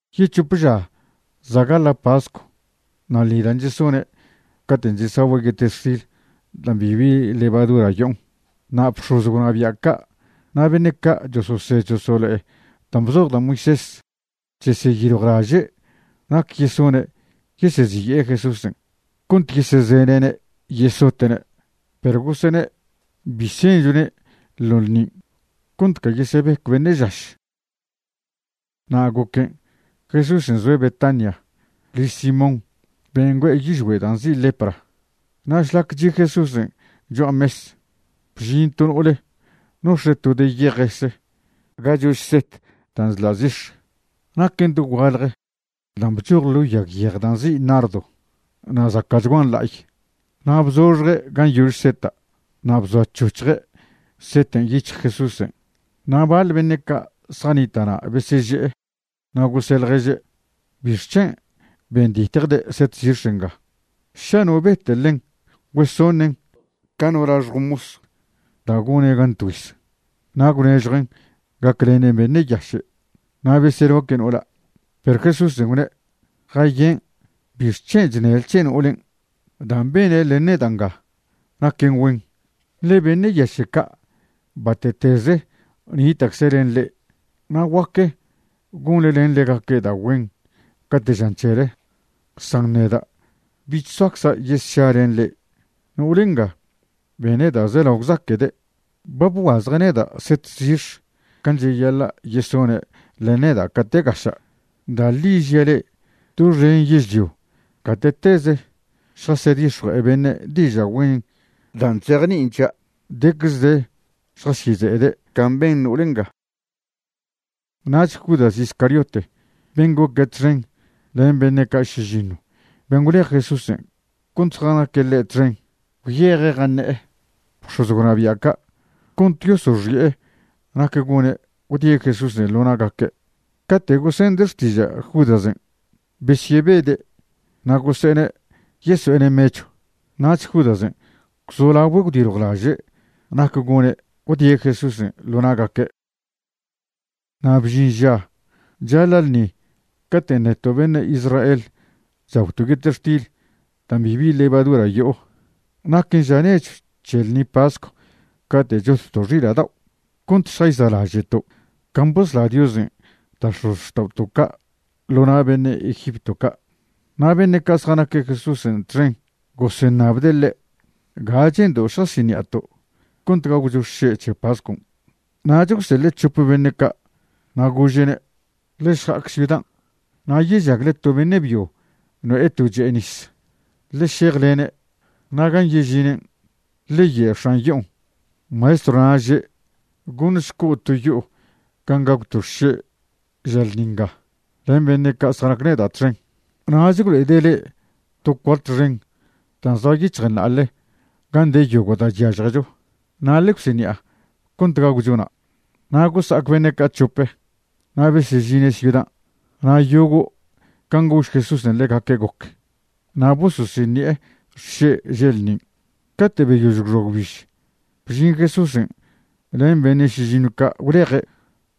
Yec̱hop ža za' gaḻa' pascw na' ḻṉi dan' chesone' caten' chesagüe' yetextil dan' bibi levadura yo'on. Na' bx̱oz gwnabia' ca' na' beṉe' ca' chososed chosolo'e dan' bzoj da' Moisés cheseyiljwlaže' nac yesone' yeseziye'e Jesúsen' cont yesezene'ne' yesote'ne'. Perw gosene': ―Bi senchone' ḻo ḻṉin' cont ca yesebec beṉe' žaš. Na' goquen' Jesúsen' zoe' Betania liž Simón ben' güe'e yižgüe' da' nzi' lepra. Na' šlac chi' Jesúsen' cho'a mes, bžin to no'ole nox̱e' to de yejese ga chož set da' chḻa' zix̱, naquen dogualje da' bchoj ḻo yag yej da' nzi' nardo, na' zaca'chguan la'ay. Na' bzoxje' gan' yož seta' na' bzoac̱hoc̱hje' seta' yic̱hj Jesúsen'. Na' baḻ beṉe' ca' zjanita' na' beseže'e, na' gose' ḻježe': ―¿Bixc̱hen' benditjde' set zix̱ nga? Ša no bete' ḻen güesoṉen ca no laxjw mos da' gone' gan tgüiz, na' gwṉežjuen' gaclenen beṉe' yaše'. Na' beseloque' no'ola'. Perw Jesúsen' gwne': ―Jayen'. ¿Bixc̱hen' chṉele c̱he no'olen'? Dan' bene' len neda' nga naquen güen. Ḻe beṉe' yaše' ca' bate'teze nita'cze' len le'e, na' guaque gonḻe len ḻegaque' da' güen cate' žan c̱hele, san neda' bich soacza' yesša len le'e. No'ole nga bene' da' zelao gwzaque'de'. Ba bguazje' neda' set zix̱ can' cheyaḻa' yesone' len neda' cate' gaša'. Da' ḻi žia' le'e, doxen yežlio gate'teze šjasedix̱jue'e beṉe' diža' güen dan' chzejni'in c̱hia', decze de šjasyeze'ede' can' ben no'ol nga. Nach Judas Iscariote, ben' goque' txen len beṉe' ca' šižiṉw ben' gwlej Jesúsen' cont zjanaque' ḻe' txen, gwyeje' jaṉe'e bx̱oz gwnabia' ca' cont yosoxi'e nac gone' gwdie' Jesúsen' ḻo na'gaque'. Cate' gosende' xtiža' Judasen', besyebede' na' gose'ene' yeso'ene' mechw. Nach Judasen' gwzolagüe' gwdiljwlaže' nac gone' gwdie' Jesúsen' ḻo na'gaque'. Na' bžin ža chaḻa' ḻṉi caten' neto' beṉe' Israel chagwto' yetextil dan' bibi levadura yo'o. Naquen ža nechw c̱he ḻṉi pascw cate' chotto' xila' dao', cont šjayza'laže'to' can' bosla Diosen' da' x̱ozxta'oto' ca' ḻo na' beṉe' Egipto ca'. Na' beṉe' ca' zjanaque' Jesúsen' txen goseṉabde' ḻe': ―¿Ga che'ndo' šjasiṉi'ato' cont gagwcho xše' c̱he pascon'? Nach gwseḻe' c̱hop beṉe' ca' na' gože'ne': ―Ḻe šja'ac ciudan', na' yežagle to beṉe' byo no'e to che'e nis. Ḻe šejlene', na' gan' yežinen', ḻe ye' x̱an yo'on: “Maestrona' že': Goṉšco' to yo'o gan' gagwto' xše' ža ḻṉi nga len beṉe' ca' zjanaque' neda' txen.” Nach gwlo'ede' le'e to cuart xen dan' zoa yic̱hjen na'ale gan' de yogo' da' chyažjecho. Na' ḻe gwsiṉi'a cont gagwcho na'. Na' gosa'ac beṉe' ca' c̱hope, na' besežine' ciudan', na' yogo' can' gož Jesúsen' ḻegaque' goc, na' bososiṉi'e xše' že' ḻṉin'. Cate' beyož gwxoa gwbiž, bžin Jesúsen' len beṉe' šižiṉw ca' gwleje'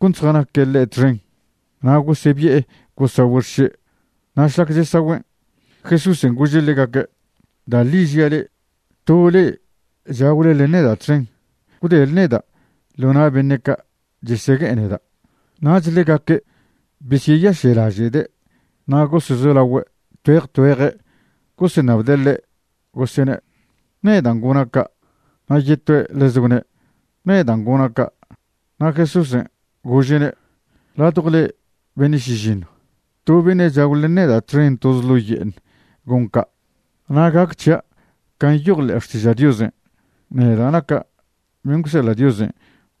cont zjanaque' ḻe' txen. Na' gosebi'e gosagüe' xše'. Na' šlac chesagüen', Jesúsen' gože' ḻegaque': ―Da' ḻi' žia' le'e, to le'e chagwle len neda' txen, gwdele neda' ḻo' na' beṉe' ca' chesegue'e neda'. Nach ḻegaque' besyeyaše'laže'de' na' gosezolagüe' tgüeje tgüeje' goseṉabde' ḻe' gosene': ―¿Nedan' gona' ca'? Na' yetoe' ḻeze gwne': ―¿Nedan' gona' ca'? Na' Jesúsen' gože'ne': ―Ladjo le'e beṉe' šižiṉw, to beṉe' chagw len neda' txen toze ḻo' ye'eṉ gon ca'. Na' gac c̱hia' can' nyoj ḻe'e Xtiža' Diosen', neda' naca' ben' gwseḻa' Diosen'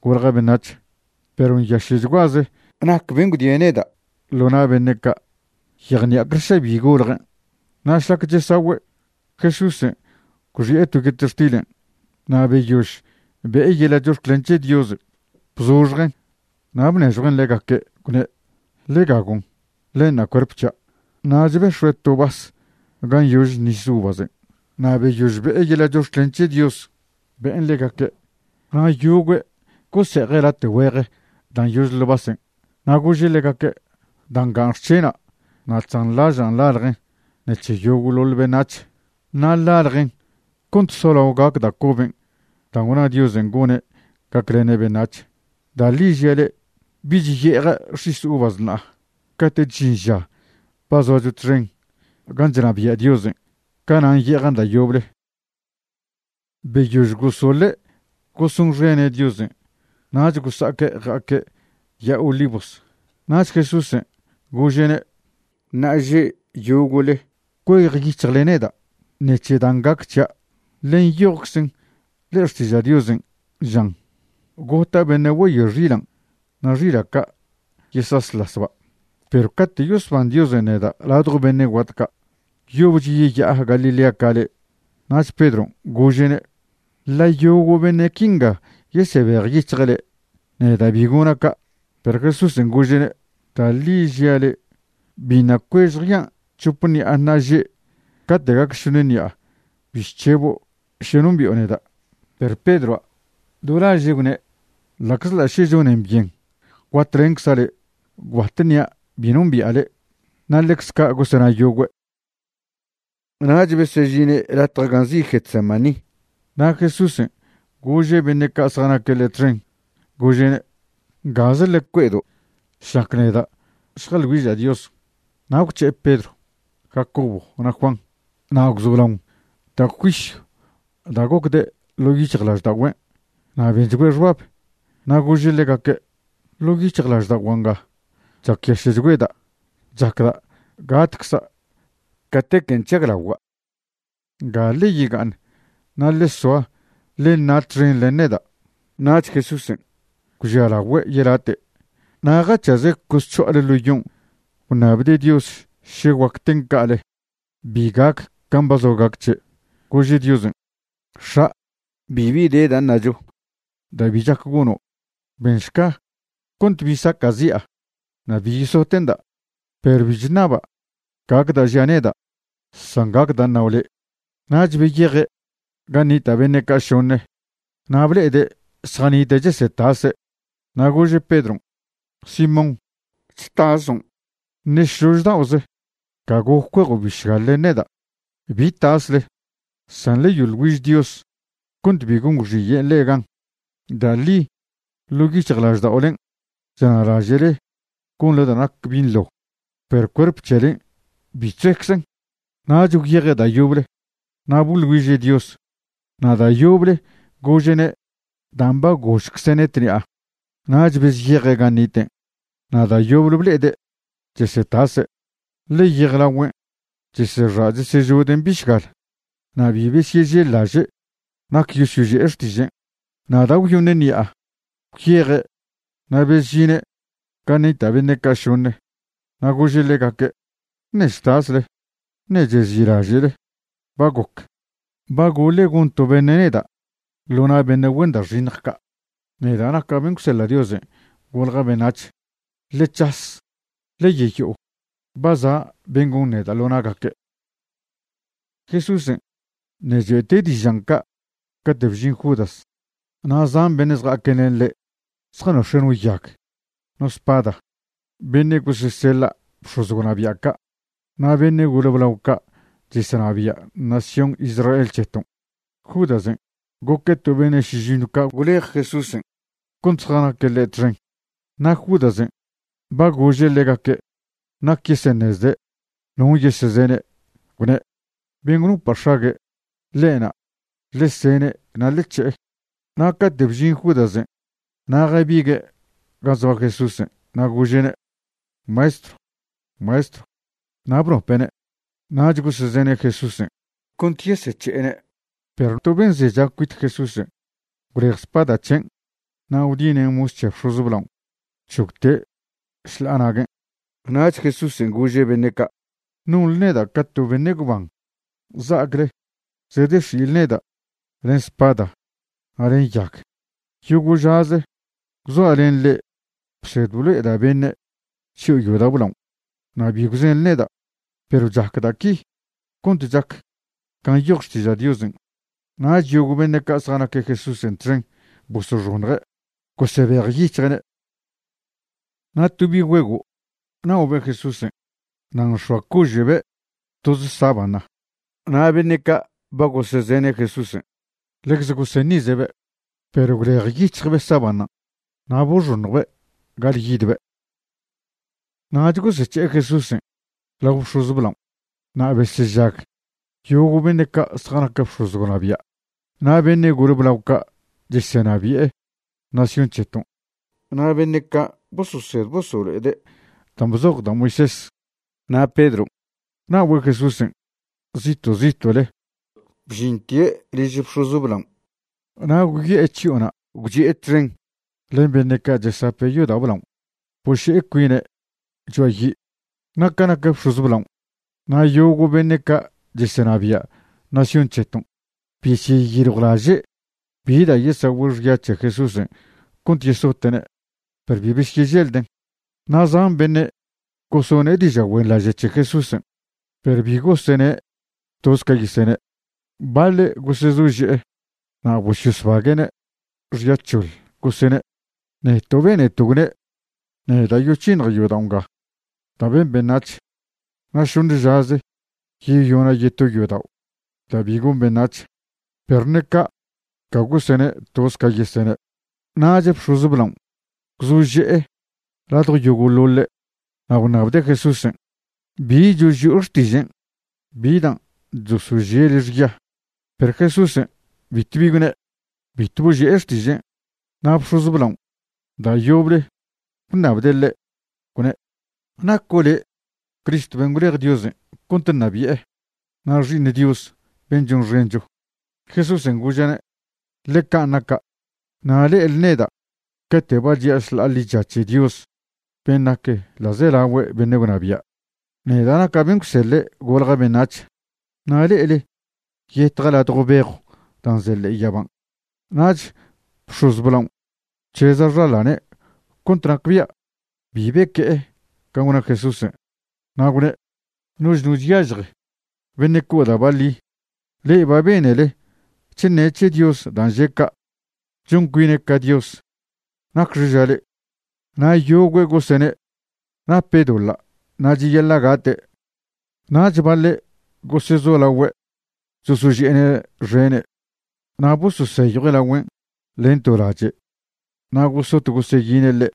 golja' beṉac̱h. Perw ¡nyaše'chguaze nac ben' gwdie' neda' ḻo na' beṉe' ca'! Yejṉi'acle ša bi goljen'. Na' šlac chesagüe', Jesúsen' gwxi'e to yetextilen', na' beyož be'e yeḻa' chox̱clen c̱he Dios, bzoxjen', na' bnežjuen' ḻegaque', gwne': ―Ḻe gagon'. Ḻenṉa' cuerp c̱hia'. Nach bex̱ue' to vas gan' yože nis uvasen' na' beyož be'e yeḻa' chox̱clen c̱he Dios, be'en ḻegaque', na' yogüe' gose'eje' late' güej dan' yože ḻo' vasen'. Na' gože' ḻegaque': ―Da' ngan' xc̱hena' na' chzanḻažan' ḻaljen ṉec̱he yogo'ḻoḻ beṉac̱h. Na' ḻaljen cont solao gac da' coben' da' gwna Diosen' gone' gaclene' beṉac̱h. Da' ḻi žia' le'e, bich ye'eja' x̱is uvas ṉa'a. Cate'ch žin ža ba zoacho txen gan' chnabia' Diosen', canan' ye'ejan' da' yoble. Beyož gosoḻe' gosonxene' Diosen' nach gosa'aque' ja'aque' Ya'a Olivos. Nach Jesúsen' gože'ne': ―Ṉa'aže' yogo'le cuejyic̱hjle neda' ṉec̱he dan' gac c̱hian'. Ḻe nyojczen ḻe'e Xtiža' Diosen', žan: “Gota' beṉe' güeyoe xilan' na' xila' ca' yesasḻasba'.” Perw cate' yosban Diosen' neda' ladjo beṉe' guat ca', yobch yeya'a Galilea ca le'e. Nach Pedron' gože'ne': ―Ḻa' yogo' beṉe' quinga yesebejyic̱hje' le', neda' bi gona' ca'. Perw Jesúsen' gože'ne': ―Da' ḻi žia le', biṉa' cuež jean' c̱hop ṉi'a ṉa'aže' cate' gac šoṉ ṉi'a bi chc̱hebo' še nombi'o neda'. Perw Pedroa' do laže' gwne': ―Ḻa'czḻa' še chonen byen guatlencza' le', gwbat ṉia' bi nombia' le'. Na' ḻecze ca' gosena' yogüe'. Nach besežine' latje gan' nzi' Getsemaní, na' Jesúsen' gože' beṉe' ca' zjanaque' ḻe' txen, gože'ne': ―Ngaze ḻe cue'edo' šlac neda' šjeḻ güiža' Dios. Na' gwc̱he'e Pedro, Jacobo na' Juan, na' gwzolaon da' juisyw da' gocde' ḻo' yic̱hjlažda'ogüen' na' benchgüe' xbab. Na' gože' ḻegaque': ―Ḻo' yic̱hjlažda'ogua' nga chacyaše'chgüeda', chacda' gatcza' catequen' chžaglagua'. Nga ḻe yega'aṉ na' ḻe soa ḻe ṉa' txen len neda'. Nach Jesúsen' gwžialagüe' yelate' na' jac̱haze' cosc̱ho'ale ḻo yon' gwṉabde' Dios še guac ten ca'ale bi gac can' ba zoa gac c̱he'. Gože' Diosen': ―X̱a', bibi de da' ṉacho da' bi chac gono'. Benšca cont bi saca'zi'a na' bi yesote'nda', perw bi chṉaba' gac da' žia' neda', san gac da' ṉao' le'. Nach beyeje' gan' nita' beṉe' ca' šoṉe, na' ble'ede' zjanite' chesetase'. Na' gože' Pedron': ―Simón ¿chtason'? ¿Ṉe šlož da'oze ca goc cuejo' bišgal len neda'? Bi tasle, san ḻe yoḻ güiž Dios cont bi gon gwxiyen' le'e gan. Da' ḻi ḻo' yic̱hjlažda'olen' chṉa'laže'le gonḻe da' nac binḻo, perw cuerp c̱helen' bi chzoeczen. Nach gwyeje' da' yoble na' boḻ güiže' Dios na' da' yoble gože'ne' dan' ba gožcze'ne' tṉi'a. Nach bezyeje' gan' niten', na' da' yoble ble'ede' chesetase', ḻe yejlagüen' chesexa' chesežoden' bišgal. Na' bi besyežellaže' nac yosyoži'e xtižen'. Na' da' gwyoṉe ṉi'a gwyeje' na' bezžine' gan' nita' beṉe' ca' šoṉe na' gože' ḻegaque': ―¿Ṉe' chtasle? ¿Ṉe' chezi'laže'le? Ba goc. Ba goḻe' gon to beṉe' neda' ḻo na' beṉe' güen da' xiṉj ca', neda' naca' ben' gwseḻa' Diosen' golja' beṉac̱h. Ḻe c̱has, ḻe yeyo'o. Ba za' ben' gon neda' ḻo na'gaque'. Jesúsen' ṉe' choe'te' dižan' ca' cate' bžin Judas, na' zan beṉe' zja'aque' len ḻe' zjanox̱e' no yag, no spada, beṉe' goseseḻa' bx̱oz gwnabia' ca' na' beṉe' gole blao ca' chesenabia' nación Israel c̱heton'. (Judasen' goque' to beṉe' šižiṉw ca' gwlej Jesúsen' cont zjanaque' ḻe' txen.) Na' Judasen' ba gože' ḻegaque' nac yeseṉezde' non' yesezene', gwne': ―Ben' gwnopa' x̱ague', ḻe'na'; ḻe sene' na' ḻe c̱he'e. Na' cate' bžin Judasen' na' jabigue' gan' zoa Jesúsen' na' gože'ne': ―Maestro, Maestro. Na' bnope'ne'. Nach gosezene' Jesúsen' cont yesec̱he'ene'. Perw to ben' zecha cuit Jesúsen' gwlej spada c̱hen' na' gwdinen' mos c̱he bx̱oz blaon' gwc̱hogte' šḻa'a naguen'. Nach Jesúsen' gože' beṉe' ca': ―¿Nonḻe neda' ca to beṉe' gwban za'acle zedex̱i'le neda' len spada na' len yag? Yogo' žaze gwzoa' len le'e bsed blo'eda' beṉe' chyo'o yodao' blaon', na' bi gwzenḻe neda'. Perw chac da' qui cont chac can' nyoj Xtiža' Diosen'. Nach yogo' beṉe' ca' zjanaque' Jesúsen' txen bosoxoṉje' gosebejyic̱hje'ne'. Na' to bi' güego' na'obe' Jesúsen', na' nx̱oa cože'be' toze sábana. Na' beṉe' ca' ba gosezene' Jesúsen' ḻecze goseṉize'be'. Perw gwlejyic̱hjbe' sábanan' na' boxoṉjbe' ga'alyidbe'. Nach gosec̱he'e Jesúsen' lao bx̱oz blaon', na' besežag yogo' beṉe' ca' zjanac bx̱oz gwnabia', na' beṉe' gole blao ca' chesenabi'e nación c̱heton' na' beṉe' ca' bososed bosolo'ede' dan' bzoj da' Moisés. Na' Pedron' na'ogüe' Jesúsen' zito' zito'le bžintie' liž bx̱oz blaon' na' gwyo'e chyo'ona' gwchi'e txen len beṉe' ca' chesape' yodao' blaon' boše'e cuine' cho'a yi'. Na' ca nac bx̱oz blaon' na' yogo' beṉe' ca' chesenabia' nación c̱heton', besyeyiljwlaže' bi da' yesagüe' xya c̱he Jesúsen' cont yesote'ne', perw bi besyeželden'. Na' zan beṉe' gosone' diža' güenḻaže' c̱he Jesúsen', perw bi gosene' toz ca yesene'. Baḻe' gosezože'e na' bososbague'ne' xya c̱hoḻ, gosene': ―Neto' beneto' gwne': “Neda' yoc̱hiṉja' yodao' nga da' ben beṉac̱h, na' šoṉe žaze yeyona' yeto yodao' da' bi gon beṉac̱h.” Perw ṉe ca' ca gosene' toz ca yesene'. Nach bx̱oz blaon' gwzože'e ladjo yogo'ḻoḻe' na' gwṉabde' Jesúsen': ―¿Bi choži'o xtižen'? ¿Bi dan' chosožie' le' xya? Perw Jesúsen' bitw bi gwne', bitw boži'e xtižen'. Na' bx̱oz blaon' da' yoble gwṉabde' ḻe', gwne': ―¿Naco' le' Cristo ben' gwlej Diosen' cont ṉabi'e, na' Xi'iṉ Dios ben' chonxencho? Jesúsen' gože'ne': ―Ḻe can' naca'. Na' le'ele neda' cate' ba chi'a šḻa'a ḻicha c̱he Dios ben' nac ḻa'zelagüe beṉe' gwnabia', neda' naca' ben' gwseḻe' golja' beṉac̱h. Na' le'ele yetja' ladjo bejw dan' ze ḻe'e yaban'. Nach bx̱oz blaon' gwc̱heza' xaḻane' cont nacbia' bi beque'e can' gwna Jesúsen', na' gwne': ―Noch no chyažje beṉe' co' da' baḻi. Ḻe'e ba benele chṉe' c̱he Dios dan' že' ca', chon cuine' ca Dios. ¿Nacxe ža le'e? Na' yogüe' gosene' nape' doḻa' na' cheyaḻa' gate'. Nach baḻe' gosezolagüe' chosoži'ene' xene' na' bososeyjue' lagüen' len to lache' na' gosot goseyine' ḻe',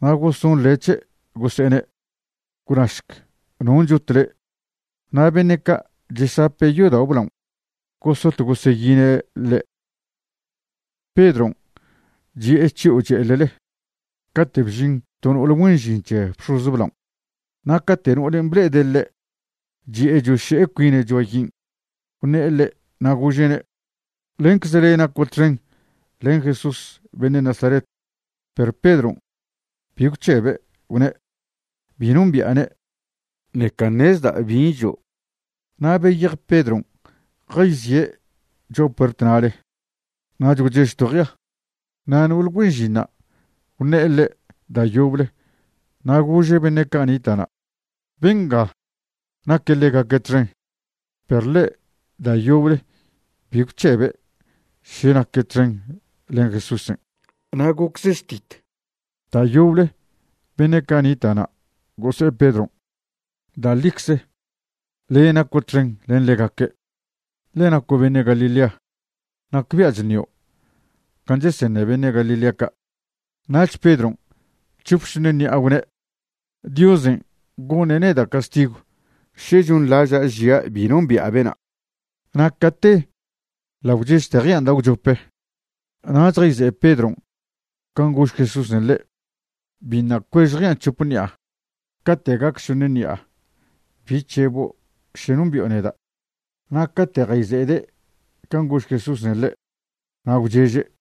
na' gosonḻe' c̱he' gose'ene': ―¡Gwnašc non' chot le'! Na' beṉe' ca' chesape' yodao' blaon' gosot goseyine' ḻe'. Pedron' chi'e chyo'o che'eḻele, cate' bžin to no'ole güen žin c̱he bx̱oz blaon'. Na' cate' no'olen' ble'ede' ḻe' chi'e choše'e cuine' cho'a yin', gwṉe'e ḻe' na' gože'ne': ―Lencze le' naco' txen len Jesús beṉe' Nazaret. Perw Pedron' bi gwc̱hebe', gwne': ―Bi nombi'ane', ṉeca ṉezda' bin' žo'. Na' beyej Pedron' jayzie' cho'a puert na'le. Nach gwchež to jea. Na' no'ol güen žinṉa' gwṉe'e ḻe' da' yoble na' gože' beṉe' ca' nita' na': ―Benga naque' ḻegaque' txen. Perw ḻe' da' yoble bi gwc̱hebe' še naque' txen len Jesúsen'. Na' gocze štit da' yoble beṉe' ca' nita' na' gose'e Pedron': ―Da' ḻicze, le' naco' txen len ḻegaque', ḻe naco' beṉe' Galilea, nacbia' chṉio' can' cheseṉe beṉe' Galilea ca'. Nach Pedron' c̱hop šoṉe ṉi'a gwne': ―Diosen' goṉe' neda' castigw še chonḻaža' žia' bi nombi'a bena'. Na' cate ḻa' gwchežte jean' da' gwchope. Nach jayze'e Pedron' can' gož Jesúsen' ḻe': “Biṉa' cuež jean' c̱hop ṉi'a cate' gac šoṉ ṉi'a bi c̱hebo' še nombi'o neda'.” Na' cate' jayze'ede' can' gož Jesúsen' ḻe', na' gwcheže'.